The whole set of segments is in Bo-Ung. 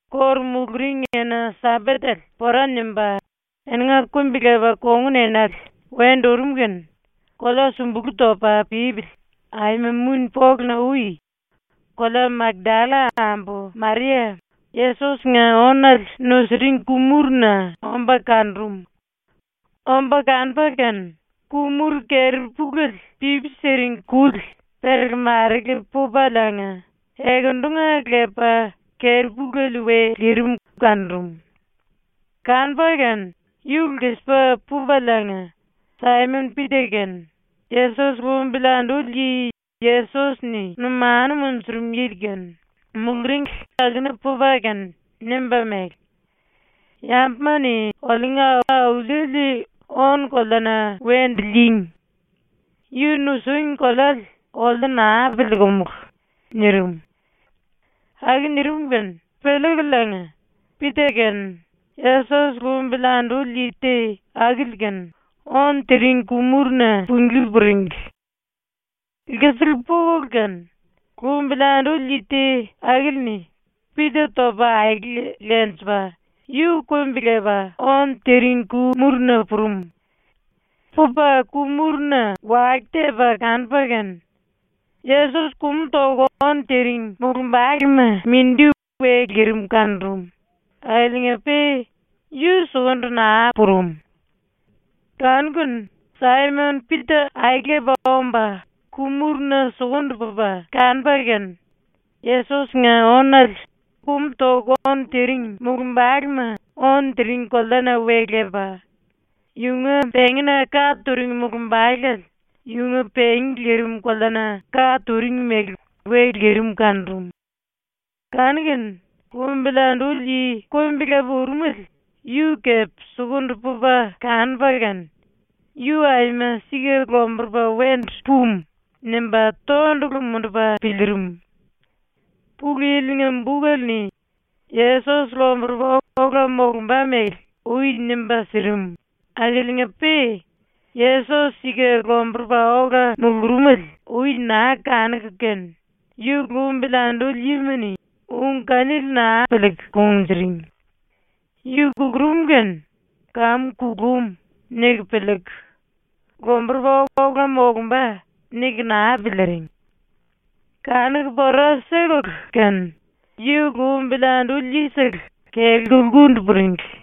⸤Kóru muluring⸥ ena-Sambatele pora nimba, eninga kumbi-lepa kongun enale wendu urum kene kolea súmbulu topa pípili aima muni-poluna-ui kolea Makdalla ambu Maria Yesos-nga ónale nusiring ku-muruna omba kanurum. Omba kanupa kene ku-muru keri-puléle pipi siring kuli perele-marele pupaliinga ekendunga lepa keri-puléle we lirim kanurum. Kanupa kene yu lkisipa pupaliinga Saimon-Pita kene Yesos lumbili anduli yi Yesos-ni numanu munjurum yili kene muluringli akuna pupa kene nimba mele: “Yambuma-ni oliunga Auliele ónu-koleana wendu lííngi. Yu nusíngi koleale oliu naa piliikumulu.” nirim. Aku nirim kene piliikuliinga Pita kene Yesos lumbili anduli yi te akili kene ónu tiring ku-muruna punglí puringli. Lkisiku pukulu kene, lumbili anduli yi te akili-ni Pita topa aele lenjipa yu kumbi-lepa ónu tiring ku-muruna purum. Pupa ku-muruna wake tepa kanupa kene Yesos kumu toku ónu tiring mulumbalema ⸤mindi⸥ we lirim kanurum, akiliinga-pe yu sukundu naa purum. Kanu-kene Saimon-Pita aelepa omba ku-muruna sukundu pupa kanupa kene, yu kumu toku ónu tiring mulumbalema ónu tiring koleana we lepa, yunga pengína ka turing mulumbalele yunga pengí lirim koleana ka turing mele we lirim kanurum. Kanu-kene lumbili anduli yi kumbi-lepa urumele yu kepe sukundu pupa kanupa kene, ‘⸤Yu aima⸥ sika ⸤lomburupa wendu pumu⸥.’ nimba tondulu mundupa piliirim. (Pulu Yili-nga bukele-ni Yesos lomburupa ola molumba mele ui nimba sirim akiliinga-pe Yesos sika lomburupa ola mulurumele ui naa kanuku kene yu lumbili anduli yima-ni ung kanili naa piliiku kunjuring. Yu kulurum kene ‘Kamu kulum.’ niku piliiku, ‘Lomburupa ola molumba.’ niku naa piliiring.) Kanuku pora sikulu kene yu lumbili anduli yisele kelku lkundu puringli.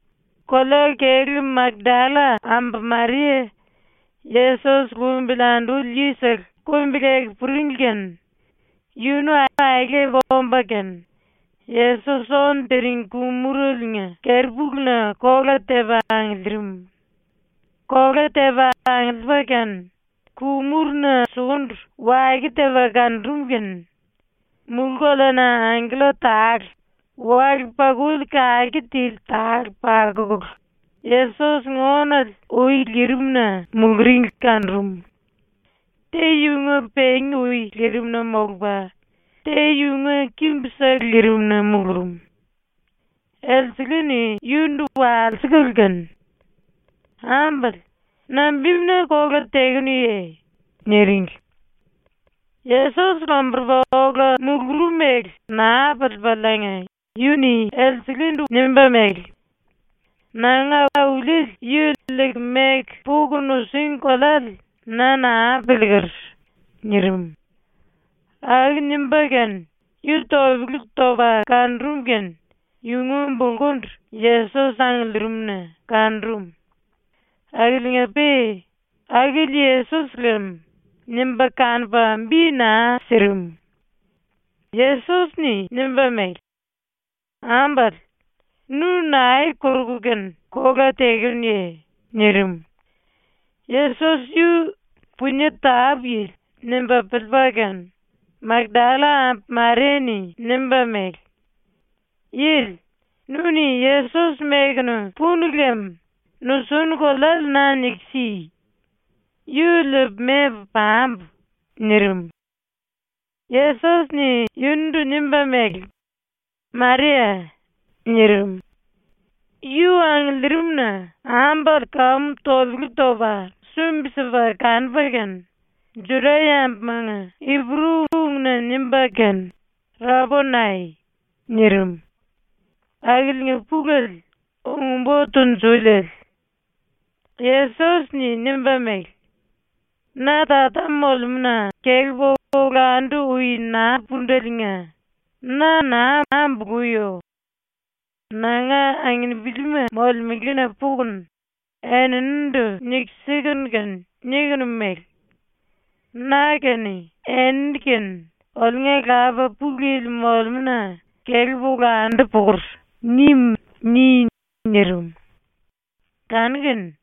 Kolea-kelú Makdalla ambu Maria Yesos lumbili anduli yisele kumbi-leku puringli kene yunu aelepa omba kene Yesos ónu tiring ku-muraliinga keri-puluna kola tepa angiliirim. Kola tepa angiliipa kene ku-muruna sukundu wake tepa kanurum kene mulú-koleana angkella tale wale-pakuli kake tili tale pakukulu Yesos-nga ónale ui lirimna muluringli kanurum. Te yunga pengí ui lirimna molupa, te yunga kimbusele lirimna mulurum. Elsele-ni yundu walsikulu kene: “Ambale, nambimuna kola tekenuye?” niringli. Yesos lomburupa ola mulurum mele naa piliipaliinga yu-ni nimba mele: “Nanga Auliele yu liiku meku puku nusíngi koleale na naa piliiker.” nirim. Aku nimba kene yu topele topa kanurum kene yunga bulkundu Yesos angiliirimu⸤na⸥ kanurum. Akiliinga-pe ‘akili Yesos ⸤lem⸥’ nimba kanupa bi naa sirim. ⸤Yesos⸥-ni nimba mele: “Ambale, nu nae koruku kene kola tekenuye?” nirim. Yesos yu ‘punie tápu-yili’ nimba piliipa kene Makdalla ambu Maria-ni nimba mele: “Yili, nu-ni Yesos mekunu punu lem nusunu koleale na niku si. Yu liipu membu pambu.” nirim. Yesos-ni yundu nimba mele: “Maria.” nirim. Yu angiliirimna ambale kamu topele topa sumbi-sipa kanupa kene Juda-yambumanga Ipuru-ungna nimba kene “Raponai.” nirim. (Akiliinga pulele ‘Ung-Bo Tunjuliele’.) Yesos-ni nimba mele: “Na Tata molemúna kelepu olandu ui naa púndeliinga na naa ambuluyo. Nanga anginipilima molemelena pukunu eninindu niku sikunu kene nikunu mele: “ “Na kene eni kene oliunga Lapa Pulu Yili molemúna kelepu olandu pukur.” nim.” ni.” nirim. Kanu-kene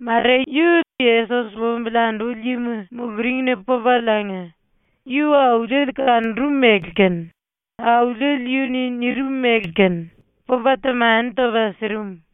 Maria yu Yesos lumbili anduli yima muluringna pupaliinga yu Auliele kanurum mele kene Auliele yu-ni nirim mele kene pupa temani topa sirim.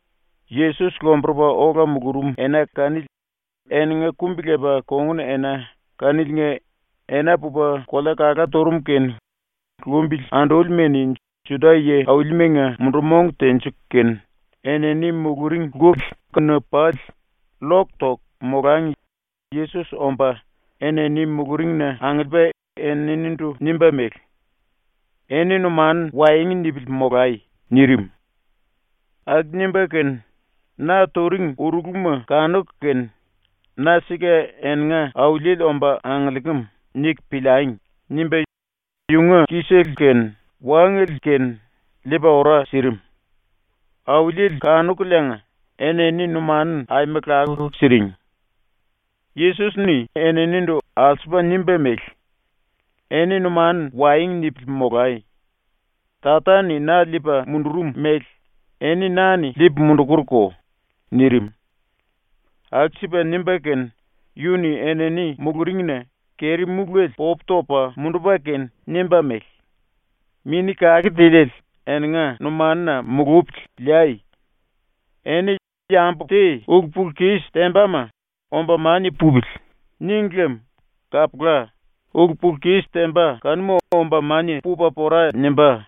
Yesos lomburupa ola mulurum ena kanili eninga kumbi-lepa kongun-ena kaniliinga ena pupa kolea kalá turum kene lumbili andúlima-ni Juda yi-aulimanga mundu-mong tenjiku kene, enini muluring lkuli kuna pali llok toku molangi Yesos omba enini muluringna angiliipa eninindu nimba mele: “Eni numanu waengu nipili molai.” nirim. Aku nimba kene, ⸤‘Na turing urulama kanuku kene ‘Na sika eninga Auliele omba angiliikim.’ niku piliangi.’ nimba⸥ yunga ki-sele kene wángele kene liipa ora sirim. Auliele kanukuliinga enini numanu aima lakuku siring. Yesos-ni eninindu alsupa nimba mele: “Eni numanu waengu nipili molai. Tata-ni na liipa mundurum mele eni na-ni liipu mundukurko.” nirim. Aku-sipa nimba kene yu-ni enini muluringna keri-múlele popu topa mundupa kene nimba mele: “Mini Kake Tiliele eninga numanuna mulupili liai. Eni yambu te ulu-pulu-kis tembama ‘Omba mania pupili.’ níngi lem kapula ulu-pulu-kis temba kanuma omba mania pupa pora nimbá.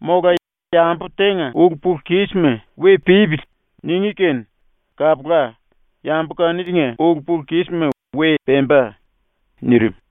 Mola yambu tenga ulu-pulu-kísima ‘We pípili.’ ningí kene kapula yambu kaniliinga ulu-pulu-kísima we pemba.” nirim.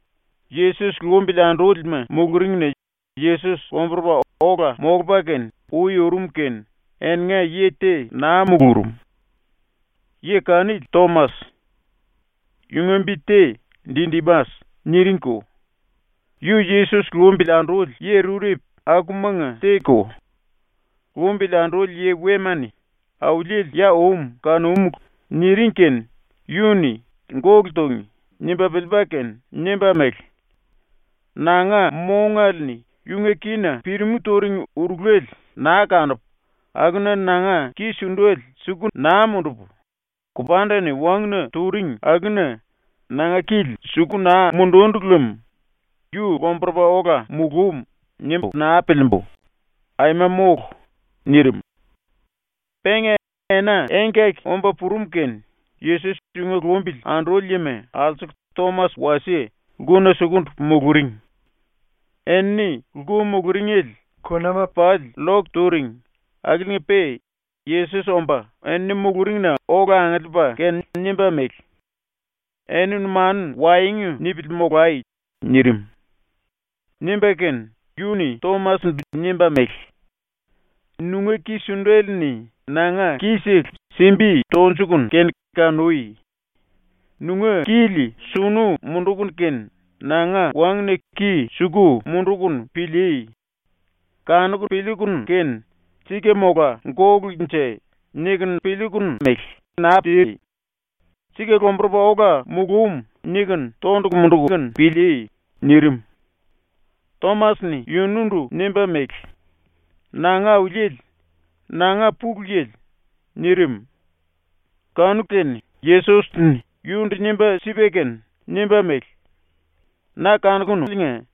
Yesos lumbili andúlima muluringna Yesos lomburupa ola molupa kene ui urum kene eninga yi te naa mulurum. Yi kanili Tomas. (Yunga bi te “Didimas” niringko.) Yu Yesos lumbili anduli yi rurepu akumanga te-ko. Lumbili anduli yi wema-ni “Auliele ya um kanúmulu.” niring kene yu-ni ‘Gólu túngi.’ nimba piliipa kene nimba mele: “Nanga mongale-ni yunga kína pirimú turing urulale naa kanupu, akuna nanga ki-sundale suku naa mundupu, kupanda-ni wanguna turing akuna nanga kili suku naa mundundu lem ‘Yu lomburupa ola mulúm.’ nimbu naa piliimbu, aima mólu.” nirim. Penga ena engkaki omba purum kene Yesos yunga lumbili anduli yima alsuku Tomas wasie lkuna sukundu muluring. Enini lku muluringele kunama pali llok turing akiliinga-pe Yesos omba enini muluringna ola angiliipa kene nimba mele: “Eni numanu waengu nipili molai.” nirim. Nimba kene yu-ni Tomas-ndu nimba mele: “Nunga ki-sundele-ni nanga ki-sele simbi tonjukunu kene kanui. Nunga kili sunu munduku kene nanga wanguna ki suku mundukunu pilíí. Kanuku piliikunu kene ‘Sika mola gólunje.’ nikunu naa pilíí. ‘Sika lomburupa ola mulúm.’ nikunu tondulu munduku pilíí.” nirim. Tomas-ni yundu nimba mele: “Nanga Auliele, nanga Pulu Yili.” nirim. Kanu-kene Yesos-ni yundu nimba sipa kene nimba mele: “Na kanukunuliinga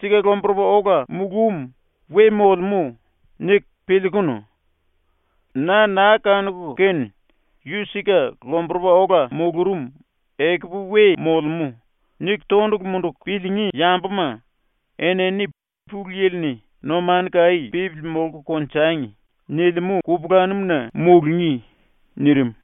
‘Sika lomburupa ola mulúm we molemú.’ niku piliikunu. Na naa kanuku kene ‘Yu sika lomburupa ola mulurum ekupu we molemú.’ niku tondulu munduku piliingí yambuma enini Pulu Yili-ni “Numanu kaí pípili molku konjangi.” nilimú kupulanum-na mulungí.” nirim.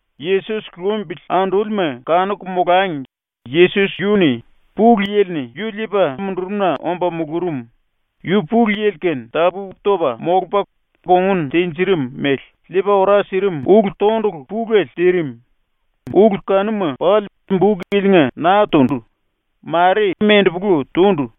Yesos lumbili andúlima kanuku molangi Yesos yu-ni ⸤Pulu Yili-ni yu liipa mundurum-na omba mulurum, yu Pulu Yili-kene tapú-topa molupa kongun tinjirim mele⸥ liipa ora sirim ulu-tondulu pulele tirim, ulu kanuma pali buk ilinga naa tundu, mare mendepolu tundu.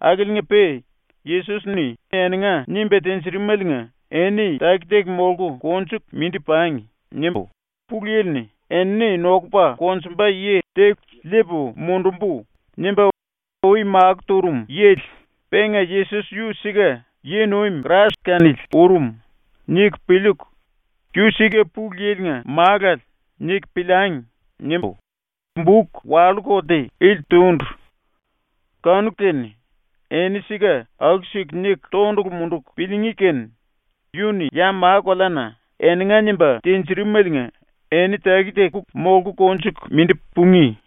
Akiliinga-pe ‘Yesos-ni eninga nimba tinjirimeliinga eni taki-taki molku konjuku mindi pangi.’ nimbu ‘ ‘Pulu Yili-ni “Enini nokupa konjumba yi te liipu mundumbu.” nimba ui makó turum yili, penga Yesos yu sika yi-nuim Krais kanili urum.’ niku piliiku, ‘Yu sika Pulu Yili-nga Málale.’ niku piliangi.’ nimbu buk wallú-kolte ili tundu. Kanu-kene eni sika aku-siku niku tondulu munduku piliingí kene yu-ni ya ma-koleana eninga nimba tinjirimeliinga eni taki-taki molku konjuku mindi pungí.